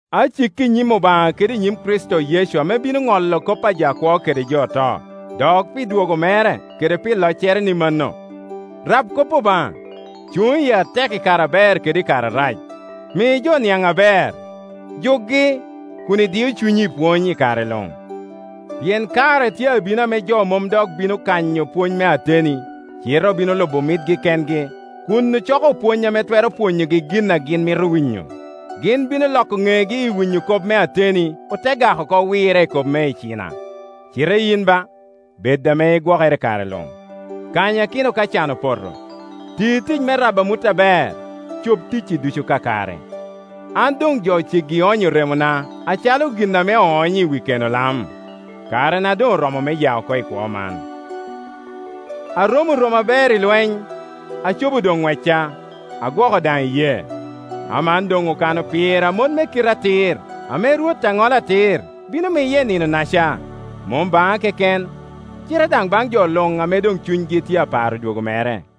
Aciki i nyim Obaŋa kede i nyim Kricito Yecu ame bino ŋolo kop a jo akwo kede jo oto, dok pi dwogo mere kede pi loccere ni mano, rab kop Obaŋa, cuŋ iye atek i kare aber kede i kare arac, mi jo niaŋ aber, jukgi, kun idio cunyi i pwony i kare luŋ. Pien kare tye abino ame jo mom dok bino kanyo pwony me ateni, cite obino lubo mitgi kengi, kun ocoko opwony ame twero pwonyogi gin a gin mito winyo. Gin bino loko ŋegi i winyo kop me ateni, ote gak oko wirre i kop me icina. Cite yin ba, bed ame igwokere i kare luŋ; kanyakino ka can opoto, ti tic me rabo amut aber, cob ticci ducu kakare. An doŋ jo ceggi onyo remona acalo gin ame oonyo i wi keno lam; karena doŋ oromo me ya oko i kwo man. Aromo romo aber i lweny, acobo doŋ ŋwecca, agwoko daŋ iyee. Aman doŋ okano pira mot me kite atir, ame Rwot a ŋolo atir, bino miya i Nino-naca; mom baŋa keken, cite daŋ baŋ jo luŋ ame doŋ cunygi tye aparo dwogo mere.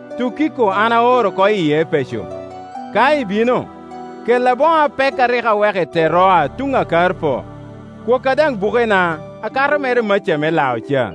Tukiko an aoro oko i Epeco. Ka ibino, kella boŋo apek a rik aweko i Teroa tuŋ a Karpo. Kwokka daŋ bukena, akato mere maca me lao ca.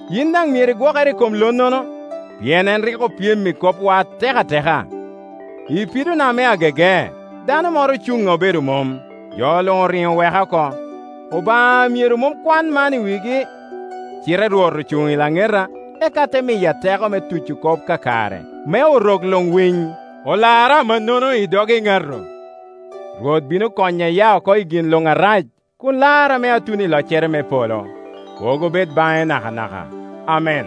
Yin daŋ myero igwokere i kom lonnono, pien en rik opyem i kopwa atek ateka. I pidona me agege, dano moro ocuŋŋa obedo mom. Jo luŋ oriŋo oweka oko. Obaŋa myero mom kwan man i wigi. Cite Rwot Ocuŋ i laŋeta, eka te miya teko me tuco kop kakare, me Orok luŋ winy; olara amannono i dog eŋato. Rwot bino konya iya oko i gin luŋ arac, kun lara me atun i loccere me polo. Kwogo bed baŋe nakanaka. Amen.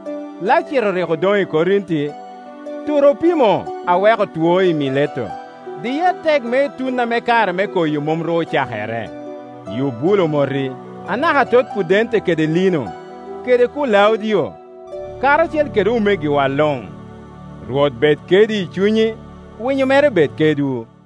Lacito rik odoŋ i Korinti; Turopimo aweko two i Mileto. Diye atek me itun ame kare me koyo mom ru ocakere. Yubulo omoti, anaka atot Pudente kede Lino, kede Kulaudio, karacel kede omegiwa luŋ. Rwot bed kedi i cunyi. Winyo mere bed kedwu.